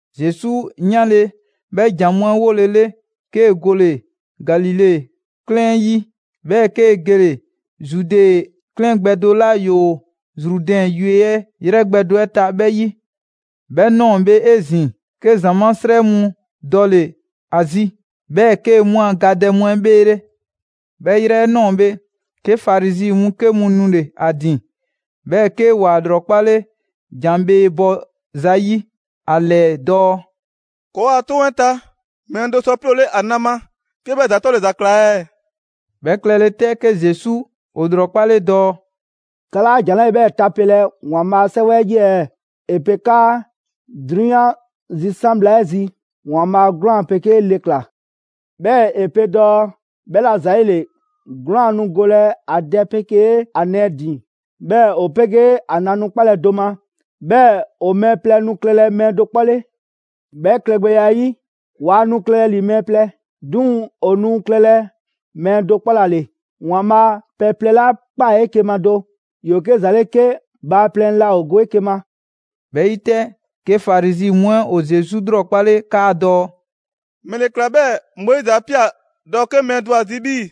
Zesu 'yanle‑ 'bhɛ jan mu 'ɛ 'wolele, 'kee‑ gole‑ Galile 'klɛɛn 'ɛ 'yi, 'bhɛɛ‑ 'kee‑ gele‑ Zude 'klɛɛn gbɛ do 'la ‑yoo Zrudɛn yue 'ɛ 'yrɛ gbɛ do 'ɛ ta 'bhɛ 'yi. 'Bhɛ ꞊nɔɔ bhe 'ezin‑, 'ke ‑zamaa' 'srɛ mu dɔle‑ ‑a zi; 'bhɛɛ‑ 'kee‑ 'mu a gadɛ mu 'ɛ bheele'. 'Bhɛ yrɛ 'ɛ ꞊nɔɔ bhe, 'ke Farizi mu 'ke mu nule‑ ‑a ‑din, 'bhɛɛ‑ 'ke ‑wa ‑lrɔkpale ‑jan bhee bɔ zayi' ‑a ‑lɛɛ dɔɔ: «‑Kɔɔ' a 'toŋ 'ɛ ta, mɛɛ do sɔ 'ploole ‑a na ma 'ke 'bhɛ ‑za 'tɔle‑ ‑za ꞊kla ɛɛ?» 'Bhɛ klɛle 'tɛ, 'ke Zesu ‑o ‑lrɔkpale dɔɔ: «'Ka 'laa ‑jan 'lɛɛ‑ 'bhɛ tapelɛ ‑Waanbhaa' a 'Sɛwɛ 'ɛ 'yi ɛɛ? ‑E pe 'kaa: ‹'Drunyan zisan' bhla 'ɛ zi, ‑Waanbhaa' 'gwlaan‑ 'pegee le ꞊kla;› 'bhɛɛ‑ ‑e pe dɔɔ: ‹'Bhɛla‑ ‑zayile 'gwlaan‑ nu golɛ ‑a dɛ 'pegee ‑a nɛɛ ‑din, 'bhɛɛ‑ ‑o 'pegee ‑a na nu 'kpalɛ‑ do ma, 'bhɛɛ‑ ‑o mɛɛ plɛ nu klɛlɛ mɛɛ do 'kpɔ 'le.› 'Bhɛ klɛgbɛya 'ɛ 'yi, waa nu klɛ ‑li mɛɛ plɛ, 'duŋ‑ ‑o nu klɛlɛ mɛɛ do 'kpɔ ‑la ‑le. ‑Waanbhaa' pɛ plɛ 'la ꞊kpaa 'eke‑ ma do, ‑yoo 'ke ‑za 'le 'ke bhaaplɛŋ 'laa ‑o go 'eke‑ ma.» 'Bhɛ 'yi 'tɛ, 'ke Farizi mu 'ɛ ‑o Zesu ꞊lrɔkpale 'kaadɔɔ‑: «‑Mɛle ꞊kla 'bhɛɛ‑ Moizi 'a ꞊pia dɔɔ 'ke mɛɛ do ‑o ‑a zi 'bhii‑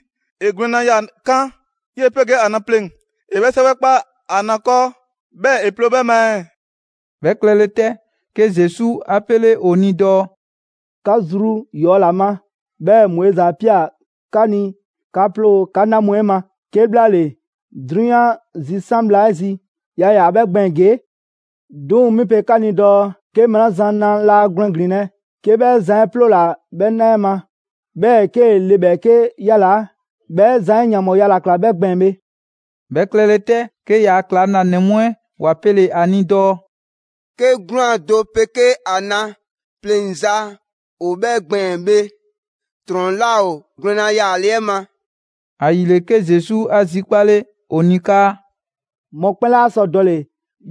‑e gwlɛnna yaa‑ 'kan 'yee‑ 'pegee ‑a na pleŋ‑, ‑e 'bhɛ 'sɛwɛ 'kpa ‑a na 'kɔɔ, 'bhɛɛ‑ ‑e ploo 'bhɛ ma ɛɛ?» 'Bhɛ klɛle 'tɛ, 'ke Zesu 'a 'pele ‑o ni dɔɔ: «'Ka zru ‑yɔɔya' ‑la ma, 'bhɛɛ‑ Moizi 'a ꞊pia 'ka ni 'ka 'ploo‑ 'ka 'na mu 'ɛ ma; 'kebhlaale, 'drunyan zisan' bhla 'ɛ zi yaa ‑yaa 'bhɛ gbɛɛn‑ ‑gee'. 'Duŋ‑ 'mi pe 'ka ni dɔɔ: 'Ke mɛɛ 'la zan na laa gwlɛn ‑glinlɛ', 'ke 'bhɛ zan 'ɛ 'ploola‑ 'bhɛ 'na 'ɛ ma, 'bhɛɛ‑ 'kee‑ le ‑bhɛɛke' 'yalaa‑, 'bhɛ zan 'ɛ ‑e ‑yanbhɔɔya ‑la ꞊kla 'bhɛ gbɛɛn‑ bhe.» 'Bhɛ klɛle 'tɛ, 'ke ‑yaa' ‑klaŋlanɛ mu 'ɛ ‑wa pele‑ ‑a ni dɔɔ: «'Ke 'gwlaan‑ do 'pegee ‑a na pleŋza ‑o 'bhɛɛ‑ gbɛɛn‑ bhe, ‑trɔn 'laa ‑o gwlɛnna yaale 'ɛ ma.» ‑Ayile, 'ke Zesu 'a zikpale ‑o ni 'kaa: «Mɔkpɛn' 'laa sɔ dɔle‑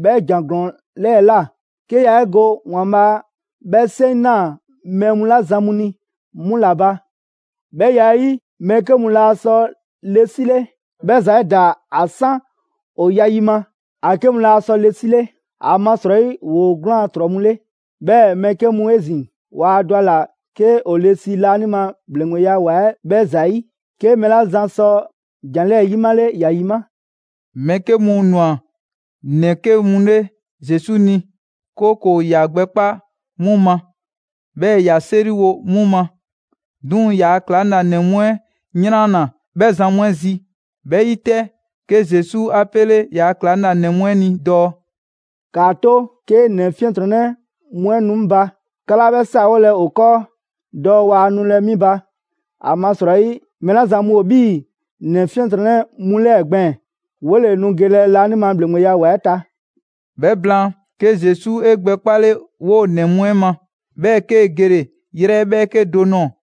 'bhɛ ‑jan ‑glɔɔn 'lɛɛ‑ ꞊la, 'ke yaa 'e go ‑Waanbhaa' 'bhɛ 'seŋ ꞊naa mɛɛ mu 'la zan mu ni, 'mu ‑la ba. 'Bhɛ ya 'ɛ 'yi, mɛɛ 'ke mu laa sɔ le 'sile, 'bhɛ ‑za 'ɛ ‑daa ‑a 'san ‑o ya yi ma. ‑A 'ke mu laa sɔ le 'sile, ‑amasrɔyi ‑woo 'gwlaan‑ ‑trɔ mu 'le. 'Bhɛɛ‑ mɛɛ 'ke mu 'ezin‑, waa dɔ ‑a ꞊la 'ke ‑o ‑le si laanima ‑bhleŋgbeya ‑wa 'ɛ 'bhɛ ‑za 'yi. 'Ke mɛɛ 'la zan sɔ ‑jan 'lɛɛ‑ 'yimale ‑ya ‑yima'!» Mɛɛ 'ke mu ‑nwa ‑nɛ 'ke mu 'le Zesu ni, 'kooko‑ ‑ya gbɛkpa' 'mu ma, 'bhɛɛ‑ ‑ya 'seriwo 'mu ma. 'Duŋ‑ ‑yaa' ‑klaŋlanɛ mu 'ɛ 'yranna‑ 'bhɛ zan mu 'ɛ zi. 'Bhɛ 'yi 'tɛ, 'ke Zesu 'a 'pele ‑yaa' ‑klaŋlanɛ mu 'ɛ ni dɔɔ: «‑Kaa 'to 'ke ‑nɛ 'fiɛntrɔnnɛ mu 'ɛ nu 'ŋ ba, 'ka 'laa 'bhɛ 'saawolɛ ‑o 'kɔɔ dɔɔ waa nulɛ 'mi ba. ‑Amasrɔyi mɛɛ 'la zan mu ‑o 'bhii‑ ‑nɛ 'fiɛntrɔnnɛ mu 'lɛɛ‑ gbɛɛn‑, 'wole‑ nu gelɛ laanima ‑bhleŋgbeya ‑wa 'ɛ ta.» 'Bhɛ blaan, 'ke Zesu 'e gbɛ 'kpale 'woo‑ ‑nɛ mu 'ɛ ma, 'bhɛɛ‑ 'kee‑ gele‑ yrɛ ‑bhɛɛke' do ꞊nɔɔ.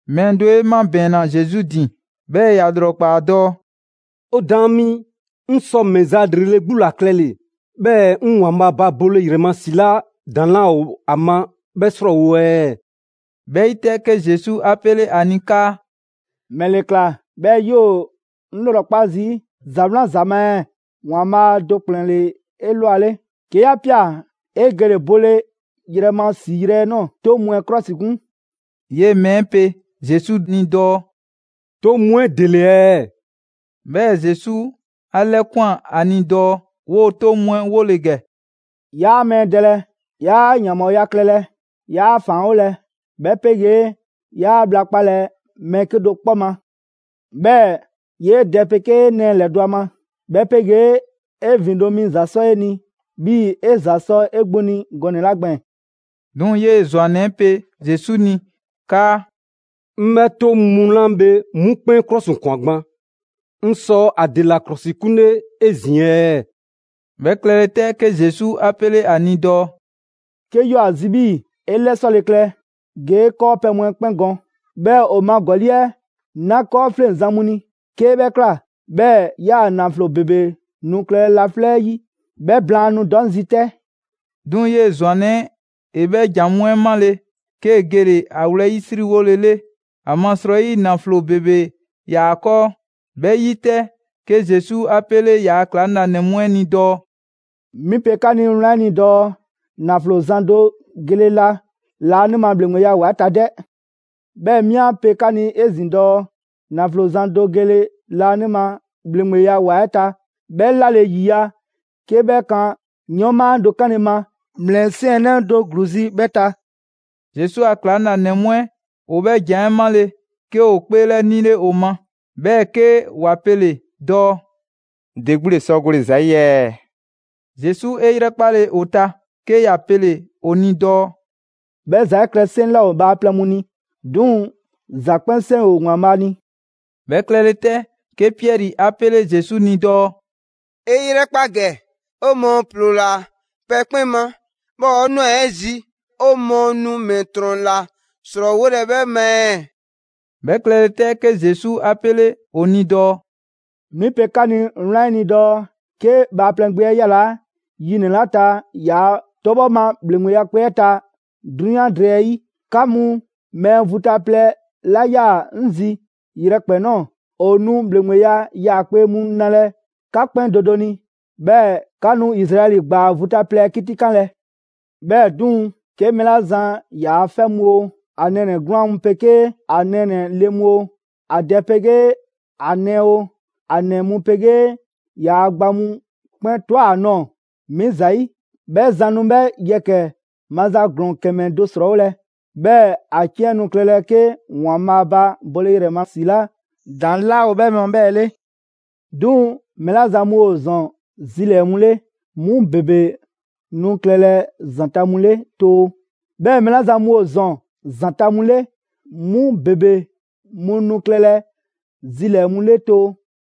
Mɛɛ do 'e 'mabɛɛnna Zesu ‑din, 'bhɛɛ‑ ‑ya ꞊lrɔkpaa dɔɔ: «'O Daan mi, 'ŋ sɔ ‑mɛ za ‑lrele' 'gbu ‑la klɛle‑, 'bhɛɛ‑ 'ŋ ‑Waanbhaa' ba bole ‑yrɛ ma ‑si 'la ‑daŋ' 'laa ‑o ‑a ma 'bhɛ 'srɔɔwo‑ ɛɛ?» 'Bhɛ 'yi 'tɛ, 'ke Zesu 'a 'pele ‑a ni 'kaa: «‑Mɛle ꞊kla 'bhɛɛ‑ 'yoo‑ 'ŋ ꞊lrɔkpa' zii' ‑za 'wlan za ma ɛɛ? ‑Waanbhaa' do ‑kplɛn ‑le 'ewlanle. 'Ke 'ya ꞊pia ‑e gele‑ bole ‑yrɛ ma ‑si yrɛ 'ɛ ꞊nɔɔ, 'toŋ mu 'ɛ 'klɔsikun.» 'Yee‑ mɛɛ pe Zesu dɔɔ: «'Toŋ mu 'ɛ ‑dele ɛɛ?» 'Bhɛɛ‑ Zesu 'a 'lɛkwan‑ ‑a ni dɔɔ 'woo‑ 'toŋ mu 'ɛ 'wole‑ ‑gɛ: «'Yaa mɛɛ dɛlɛ; 'yaa ‑yanbhɔɔya klɛlɛ, 'yaa ‑faanwolɛ, 'bhɛ 'pegee 'yaa bhla 'kpalɛ‑ mɛɛ 'kedo‑ 'kpɔ ma; 'bhɛɛ‑ 'yee dɛ 'pegee 'e nɛɛ ‑lɛdɔ' ‑a ma; 'bhɛ 'pegee 'e ‑vindo' mi ‑za 'sɔ 'e ni 'bhii‑ 'e ‑za sɔ 'e 'gbu ni gɔnɛ‑ 'la gbɛɛn‑.» 'Duŋ‑ 'yee‑ ‑zwannɛ 'e pe Zesu ni 'kaa: «'Ŋ 'bhɛ 'toŋ mu 'la bhe 'mu 'kpɛn 'klɔsikwan gban, 'ŋ sɔ ‑a ‑dela 'klɔsikunle 'ezin‑ ɛɛ?» 'Bhɛ klɛle 'tɛ, 'ke Zesu 'a 'pele ‑a ni dɔɔ: «'Kee 'yoo‑ ‑a zi 'bhii‑ 'e 'lɛsɔle klɛ, ge 'e 'kɔɔpɛ‑ mu 'ɛ 'kpɛn gɔn, 'bhɛɛ‑ ‑o ma ‑gɔli' 'ɛ 'na 'kɔɔfleŋzan mu ni. 'Kee 'bhɛ ꞊kla, 'bhɛɛ‑ 'yaa‑ ‑naflo ‑bebe nu klɛlɛ laflɛ' 'yi. 'Bhɛ blaan, nu dɔ 'ŋ zi 'tɛ.» 'Duŋ‑ 'yee‑ ‑zwannɛ 'ɛ ‑e 'bhɛ ‑jan mu 'ɛ 'male‑, 'kee‑ gele‑ ‑a wlɛyisriwole 'le, ‑amasrɔyi naflo ‑bebe ‑yaa 'kɔɔ. 'Bhɛ 'yi 'tɛ, 'ke Zesu 'a 'pele ‑yaa' ‑klaŋlanɛ mu 'ɛ ni dɔɔ: «'Mi pe 'ka ni wlan 'ɛ ni dɔɔ: ‑Naflo zan do gele la laanima ‑bhleŋgbeya ‑wa 'ɛ ta 'dɛ. 'Bhɛɛ‑ 'mi 'a pe 'ka ni 'ezin‑ dɔɔ: ‑Naflo zan do gele laanima ‑bhleŋgbeya ‑wa 'ɛ ta 'bhɛ 'lale‑ 'yiya‑ 'ke 'bhɛ kan 'yɔɔnma do 'kanle‑ ma ‑mlɛsiɛnnɛ do ‑gluu zi 'bhɛ ta.» Zesu a ‑klaŋlanɛ mu 'ɛ, ‑o 'bhɛ ‑jan 'ɛ 'male‑, 'ke ‑o 'kpeelɛnile ‑o ma, 'bhɛɛ‑ 'ke ‑wa pele‑ dɔɔ: «‑De 'gbu ‑le sɔ gole‑ ‑za 'yi ɛɛ?» Zesu 'e 'yrɛkpale ‑o ta, 'ke ‑ya pele‑ ‑o ni dɔɔ: «'Bhɛ ‑za 'ɛ klɛ 'seŋ 'laa ‑o bhaaplɛŋ mu ni. 'Duŋ‑ ‑za 'kpɛn 'seŋ ‑o ‑Waanbhaa' ni.» 'Bhɛ klɛle 'tɛ, 'ke Piɛri 'a 'pele Zesu ni dɔɔ: «'E 'yrɛkpa ‑gɛ, 'o mɔɔ ‑ploola pɛ 'kpɛn ma, 'bhɛɛ‑ ‑o ꞊nwa 'e zi, 'o mɔɔ nu ‑mɛ ‑trɔn ‑la ‑srɔɔwolɛ 'bhɛ ma ɛɛ?» 'Bhɛ klɛle 'tɛ, 'ke Zesu 'a 'pele ‑o ni dɔɔ: «'Mi pe 'ka ni wlan 'ɛ ni dɔɔ: 'Ke Bhaaplɛŋ Gbe 'ɛ 'yalaa‑ yi ‑nɛ 'la ta ‑yaa' 'tɔbhɔ ma ‑bhleŋgbe 'yaakpe‑ 'ɛ ta 'drunyan drɛɛ 'ɛ 'yi, 'ka mu mɛɛ vu ta plɛ 'la 'yaa‑ 'ŋ zi yrɛkpɛn‑ ꞊nɔɔ, ‑o nu ‑bhleŋgbeya 'yaakpe‑ mu nalɛ 'ka 'kpɛn do do ni, 'bhɛɛ‑ 'ka nu Izraɛli ‑gbaa vu ta plɛ 'ɛ 'kitikanlɛ. 'Bhɛɛ‑ 'duŋ‑, 'ke mɛɛ 'la zan ‑yaa' 'fɛ mu oo, ‑a nɛɛnɛ‑ 'gwlaan‑ mu 'pegee ‑a nɛɛnɛ‑ le mu oo, ‑a dɛ 'pegee ‑a nɛɛ oo, ‑a ‑nɛ mu 'pegee ‑yaa' gba mu 'kpɛn ꞊twa ‑a nɔɔ‑ 'mi ‑zayi', 'bhɛ zan nu 'bhɛ yɛkɛ‑ maza ‑glɔɔn ‑kɛmɛ do ‑srɔɔwolɛ, 'bhɛɛ‑ ‑a 'ciɛn nu klɛlɛ 'ke ‑Waanbhaa' ba bole ‑yrɛ ma ‑si 'la ‑daŋ' 'laa ‑o 'bhɛ ma 'bhɛɛ‑ 'le. 'Duŋ‑, mɛɛ 'la zan mu ‑o ‑zɔn zilɛɛ‑ mu 'le, 'mu ‑bebe nu klɛlɛ ‑zanta' mu 'le too; 'bhɛɛ‑ mɛɛ 'la zan mu ‑o ‑zɔn ‑zanta' mu 'le, 'mu ‑bebe mu nu klɛlɛ zilɛɛ‑ mu 'le too.»